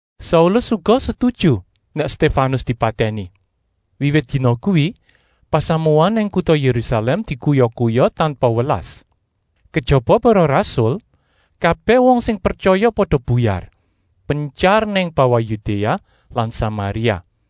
Saulus uga setuju nèk Stéfanus dipatèni. Wiwit dina kuwi pasamuan nang kuta Yérusalèm dikuya-kuya tanpa welas. Kejaba para rasul, kabèh wong sing pretyaya pada buyar, pentyar nang bawah Yudéa lan Samaria.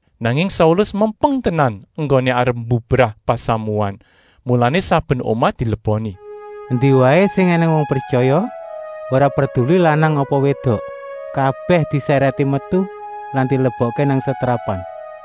Nanging Saulus mempeng tenan enggoné arep mbubrah pasamuan, mulané saben omah dileboni. Endi waé sing ènèng wong pretyaya, ora perduli lanang apa wédok, kabèh disèrèti metu lan dilebokké nang setrapan.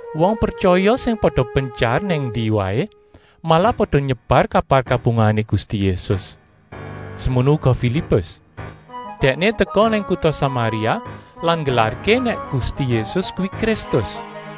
Wong pretyaya sing pada pentyar nang endi waé malah pada nyebar kabar kabungahané Gusti Yésus. Semono uga Filipus; dèkné teka nang kuta Samaria lan nggelarké nèk Gusti Yésus kuwi Kristus.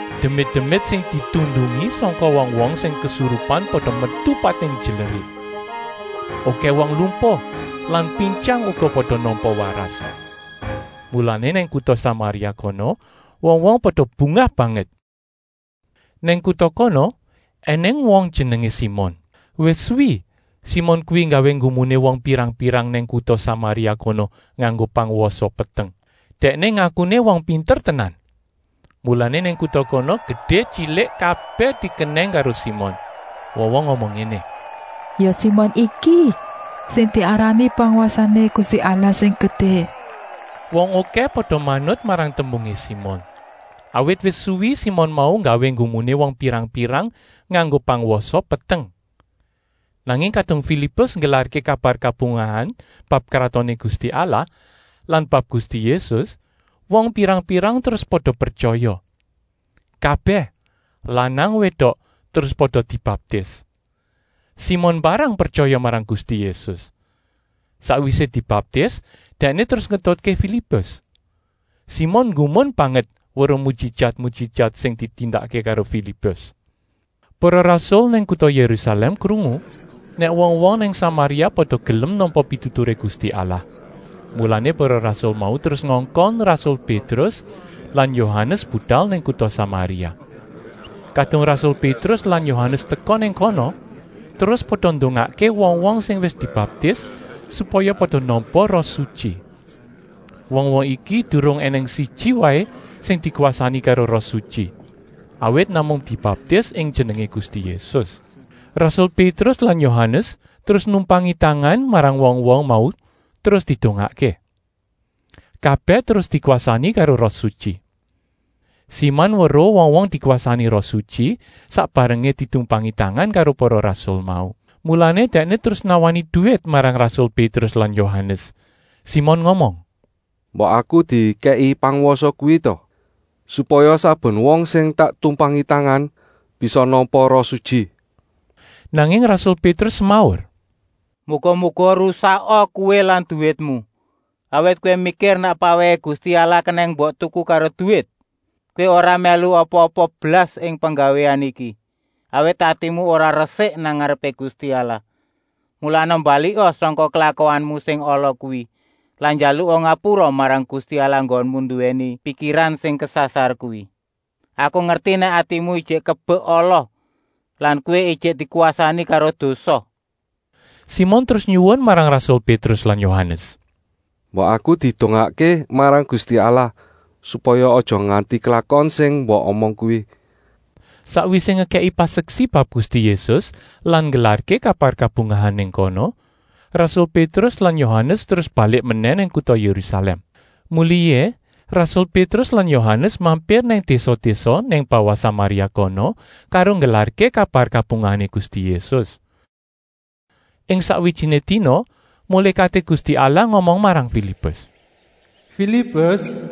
Demit-demit sing ditundungi sangka wong-wong sing kesurupan pada metu pating njlerit. Okèh wong lumpuh lan pintyang uga pada nampa waras. Mulané nang kuta Samaria kono wong-wong pada bungah banget. Nang kuta kono ènèng wong jenengé Simon. Wis suwi Simon kuwi nggawé nggumuné wong pirang-pirang nang kuta Samaria kono nganggo pangwasa peteng. Dèkné ngakuné wong pinter tenan. Mulané nang kuta kono gedé-tyilik kabèh dikenèng karo Simon. Wong-wong ngomong ngéné: “Ya Simon iki sing diarani pangwasané Gusti Allah sing gedé.” Wong okèh pada manut marang tembungé Simon, awit wis suwi Simon mau nggawé nggumuné wong pirang-pirang nganggo pangwasa peteng. Nanging kadung Filipus nggelarké kabar kabungahan bab Kratoné Gusti Allah lan bab Gusti Yésus, wong pirang-pirang terus pada pretyaya. Kabèh, lanang-wédok, terus pada dibaptis. Simon mbarang pretyaya marang Gusti Yésus. Sakwisé dibaptis dèkné terus ngetutké Filipus. Simon nggumun banget weruh mujijat-mujijat sing ditindakké karo Filipus. Para rasul nang kuta Yérusalèm krungu nèk wong-wong nang Samaria pada gelem nampa pituturé Gusti Allah. Mulané para rasul mau terus ngongkon rasul Pétrus lan Yohanes budal nang kuta Samaria. Kadung rasul Pétrus lan Yohanes teka nang kono terus pada ndongakké wong-wong sing wis dibaptis, supaya pada nampa Roh Sutyi. Wong-wong iki durung ènèng siji waé sing dikwasani karo Roh Sutyi, awit namung dibaptis ing jenengé Gusti Yésus. Rasul Pétrus lan Yohanes terus numpangi tangan marang wong-wong mau terus didongakké. Kabèh terus dikwasani karo Roh Sutyi. Simon weruh wong-wong dikwasani Roh Sutyi sak barengé ditumpangi tangan karo para rasul mau. Mulané dèkné terus nawani duwit marang rasul Pétrus lan Yohanes. Simon ngomong: “Mbok aku dikèki pangwasa kuwi ta, supaya saben wong sing tak tumpangi tangan bisa nampa Roh Sutyi.” Nanging rasul Pétrus semaur: “Muga-muga rusaka kowé lan duwitmu, awit kowé mikir nèk pawèhé Gusti Allah kenèng mbok tuku karo duwit! Kowé ora mèlu apa-apa blas ing penggawéan iki, awit atimu ora resik nang ngarepé Gusti Allah. Mulané, mbalika sangka klakuanmu sing ala kuwi lan njaluka ngapura marang Gusti Allah enggonmu nduwèni pikiran sing kesasar kuwi. Aku ngerti nèk atimu ijik kebek ala lan kowé ijik dikwasani karo dosa!” Simon terus nyuwun marang rasul Pétrus lan Yohanes: “Mbok aku didongakké marang Gusti Allah, supaya aja nganti klakon sing mbok omong kuwi!” Sakwisé ngekèki paseksi bab Gusti Yésus lan nggelarké kabar kabungahan nang kono, rasul Pétrus lan Yohanes terus balik menèh nang kuta Yérusalèm. Mulihé rasul Pétrus lan Yohanes mampir nang désa-désa nang bawah Samaria kono karo nggelarké kabar kabungahané Gusti Yésus. Ing sakwijiné dina mulékaté Gusti Allah ngomong marang Filipus: “Filipus,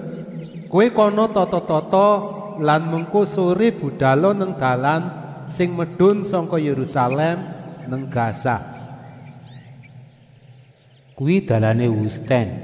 kowé kana tata-tata lan mengko soré budala nang dalan sing medun sangka Yérusalèm nang Gaza.” Kuwi dalané wustèn.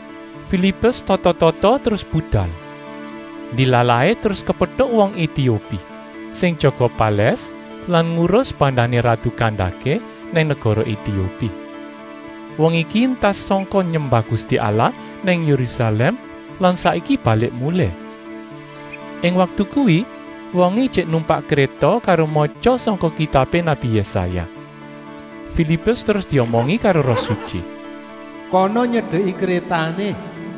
Filipus tata-tata terus budal. Ndilalahé terus kepetuk wong Etiopi, sing jaga palès lan ngurus bandané ratu Kandaké nang negara Etiopi. Wong iki entas sangka nyembah Gusti Allah nang Yérusalèm lan saiki balik mulih. Ing waktu kuwi wongé ijik numpak kréta karo matya sangka kitabé nabi Yésaya. Filipus terus diomongi karo Roh Sutyi: “Kana nyedeki krétané.”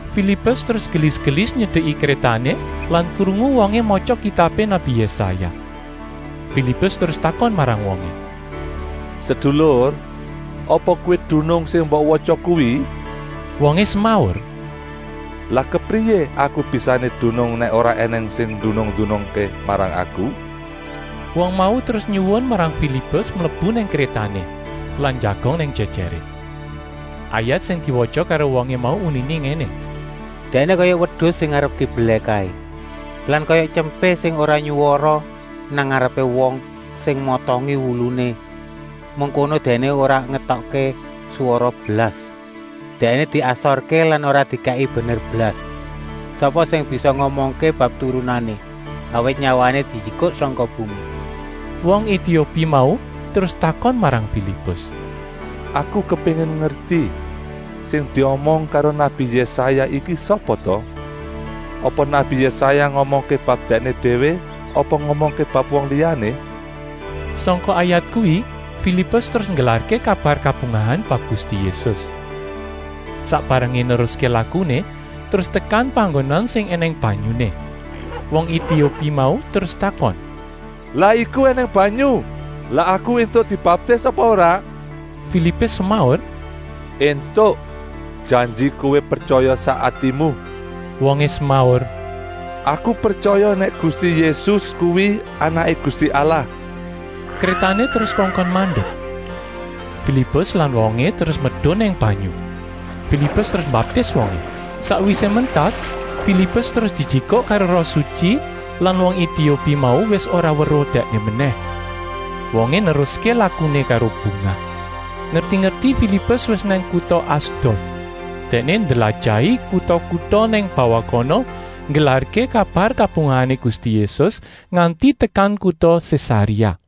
Filipus terus gelis-gelis nyedeki krétané lan krungu wongé matya kitabé nabi Yésaya. Filipus terus takon marang wongé: “Sedulur, apa kowé dunung sing mbok watya kuwi?” Wongé semaur: “Lah kepriyé aku bisané dunung nèk ora ènèng sing ndunung-ndunungké marang aku?” Wong mau terus nyuwun marang Filipus mlebu nang krétané lan njagong nang jèjèré. Ayat sing diwatya karo wongé mau uniné ngéné: “Dèkné kaya wedus sing arep dibelèh kaé lan kaya tyempé sing ora nyuwara nang ngarepé wong sing motongi wuluné. Mengkono Dèkné ora ngetokké swara blas. Dèkné diasorké lan ora dikèki bener blas. Sapa sing bisa ngomongké bab turunané, awit nyawané dijikuk sangka bumi.” Wong Etiopi mau terus takon marang Filipus: “Aku kepéngin ngerti, sing diomong karo nabi Yésaya iki sapa ta? Apa nabi Yésaya ngomongké bab dèkné déwé apa ngomongké bab wong liyané?” Sangka ayat kuwi Filipus terus nggelarké kabar kabungahan bab Gusti Yésus. Sak barengé neruské lakuné terus tekan panggonan sing ènèng banyuné. Wong Etiopi mau terus takon: “Lah iku ènèng banyu! Lah aku éntuk dibaptis apa ora?” Filipus semaur: “Entuk, janji kowé pretyaya sak atimu!” Wongé semaur: “Aku pretyaya nèk Gusti Yésus kuwi Anaké Gusti Allah!” Krétané terus kongkon mandek. Filipus lan wongé terus medun nang banyu. Filipus terus mbaptis wongé. Sakwisé mentas Filipus terus dijikuk karo Roh Sutyi lan wong Etiopi mau wis ora weruh dèkné menèh. Wongé neruské lakuné karo bungah. Ngerti-ngerti Filipus wis nang kuta Asdod. Dèkné ndlajahi kuta-kuta nang bawah kono nggelarké kabar kabungahané Gusti Yésus nganti tekan kuta Sésaréa.